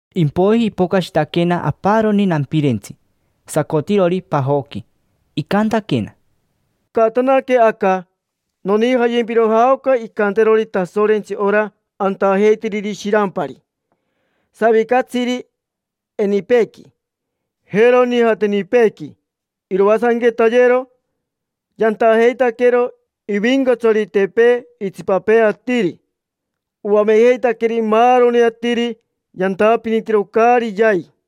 Impoiji ipocashitaquena aparoni nampirentsi, sacotirori pajoqui. Icantaquena: —Caatanaque aca: nonijayempiro jaoca incanterori Tasorentsi ora antajeitiriri shirampari, savicatsiri enipeequi, jero nijateenipeequi. Iroasanquetayero. Yantajeitaquero ivincatsaritepee itsipapee atiri. Oamejeitaqueri maaroni atiri yantapinitiro caari yai.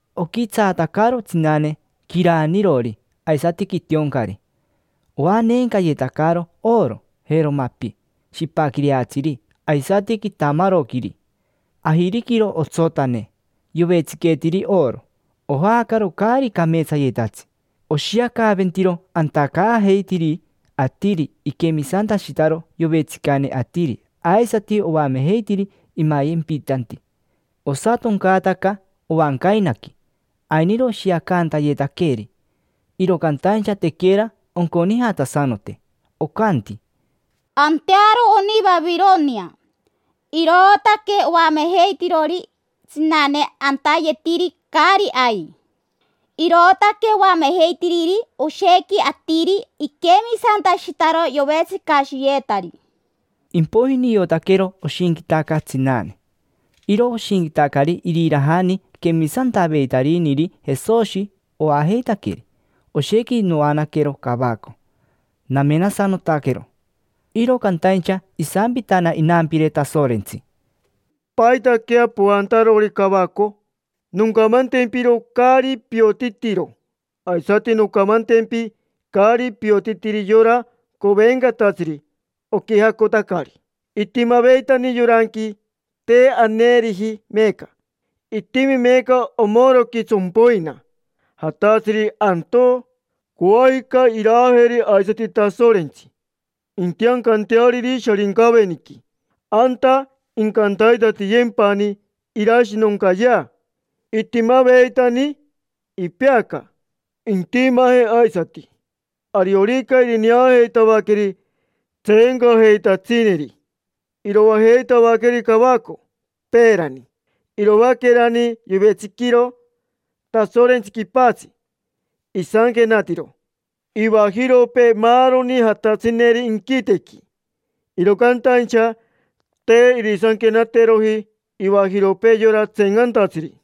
Oquitsaatacaro tsinane quiraanirori aisati quitioncari. Oaneencayetacaro oro, jero mapi shipaquireatsiri aisati quitamaroquiri. Ajiriquiro otsotane, yovetsiqueetiri oro; ojaacaro caari cameetsayetatsi, oshiacaventiro antacaajeitiri atiri iquemisantashitaro yovetsicane atiri aisati oamejeitiri imayempitanti. Osatoncaataca ovancainaqui: ainiro oshiacantayetaqueeri, iro cantaincha tequera onconijatasanote. Ocanti: “Antearo oni Vavironia, irootaque oamejeitirori tsinane antayetiri caari ai. Irootaque oamejeitiriri oshequi atiri iquemisantashitaro yovetsicashiyetari”. Impoiji niotaquero oshinquitaca tsinane. Iro oshinquitacari irirajani quemisantaveitariniri Jesoshi oajeitaqueri. Oshequi noanaquero cavaco, namenasanotaquero, sorererere. Iro cantaincha isampitana inampire Tasorentsi: —¿Paitaquea poantarori cavaco? Noncamantempiro caari piotitiro, aisati noncamantempi caari piotitiri yora covencatatsiri oquijacotacari. Itimaveitani yoranqui, te aneeriji meeca, itimi meeca omoroqui tsompoina, jatatsiri antoo. Coajica iraajeri aisati Tasorentsi, intiancanteariri Sharincaveniqui: anta incantaitatiyempani irashinoncayea. Itimaveitani, ipeaca, intimaje aisati; ariorica irineajeitavaqueri tseencajeitatsineri, iroajeitavaqueri cavaco. Peerani, iroaquerani yovetsiquiro Tasorentsi quipatsi, isanquenatiro ivajiropee maaroni jatatsineri inquitequi, iro cantaincha te irisanquenateroji ivajiropee yora tseencantatsiri.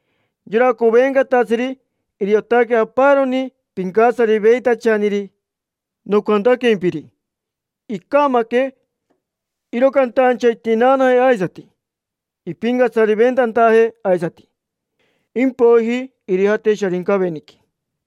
Yora covencatatsiri, iriotaque aparoni pincatsariveitachaniri nocantaquempiri: “Icamaque”. Iro cantaincha intinaanaje aisati, impincatsariventantaje aisati, impoiji irijate Sharincaveniqui.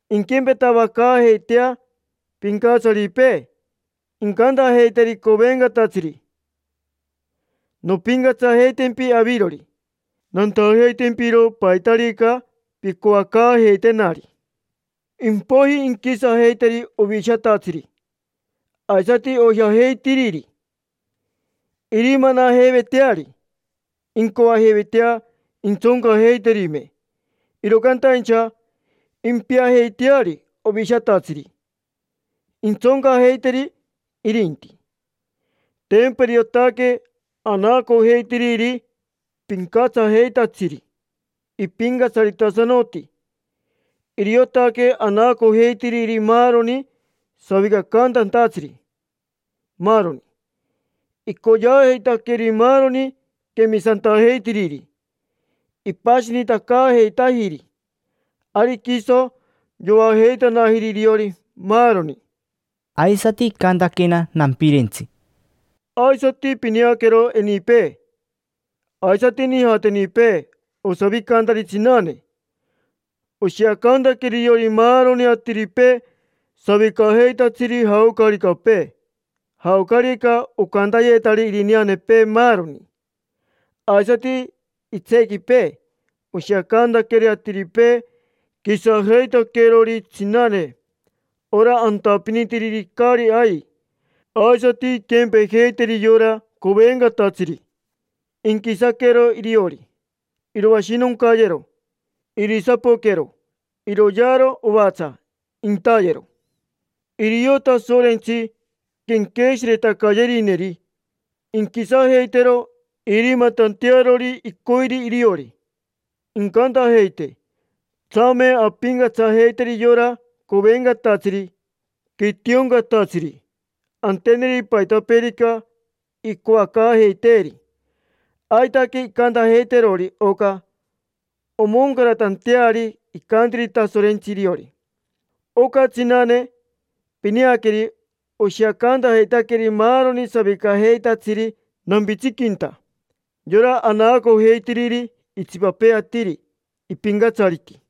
Inquempetavacaajeitea pincatsaripee, incantajeiteri covencatatsiri: “Nompincatsajeitempi avirori, nantajeitempiro paitarica pincoacaajeitenari”. Impoiji inquisajeiteri Ovishatatsiri, aisati oijajeitiriri: irimanajeiveteari, incoajeivetea intsoncajeiterime. Iro cantaincha impiajeiteari Ovishatatsiri, intsoncajeiteri irinti. Tempa iriotaque anaacojeitiriri pincatsajeitatsiri, ipincatsaritasanoti; iriotaque anaacojeitiriri maaroni savicacantantatsiri, maaroni. Icoyeajeitaqueri maaroni quemisantajeitiriri, ipashinitacaajeitajiri, ari quiso yoajeitanajiri iriori, maaroni. Aisati icantaquena nampirentsi: —Aisati pineaquero enipee aisati nijatenipee osavicantari tsinane. Oshiacantaqueri iriori maaroni atiripee savicajeitatsiri jaocaricapee, jaocarica ocantayetari irineanepee, maaroni. Aisati itseequipee oshiacantaqueri atiripee quisajeitaquerori tsinane: ora antapinitiriri caari ai. Aisati inquempejeiteri yora covencatatsiri, inquisaquero iriori. Iroashinoncayero, irisapoquero, iroyearo ovatsa, intayero. Irio Tasorentsi quenqueshiretacayerineri inquisajeitero, irimatantearori icoiri iriori. Incantajeite: “Tsame ampincatsajeiteri yora covencatatsiri quitioncatatsiri, anteneri paitapeerica incoacaajeiteeri”. Aitaque incantajeiterori oca omoncaratanteari icantiri Tasorentsi iriori. Oca tsinane pineaqueri oshiacantajeitaqueri maaroni savicajeitatsiri nampitsiquinta: yora anaacojeitiriri itsipapee atiri ipincatsariti.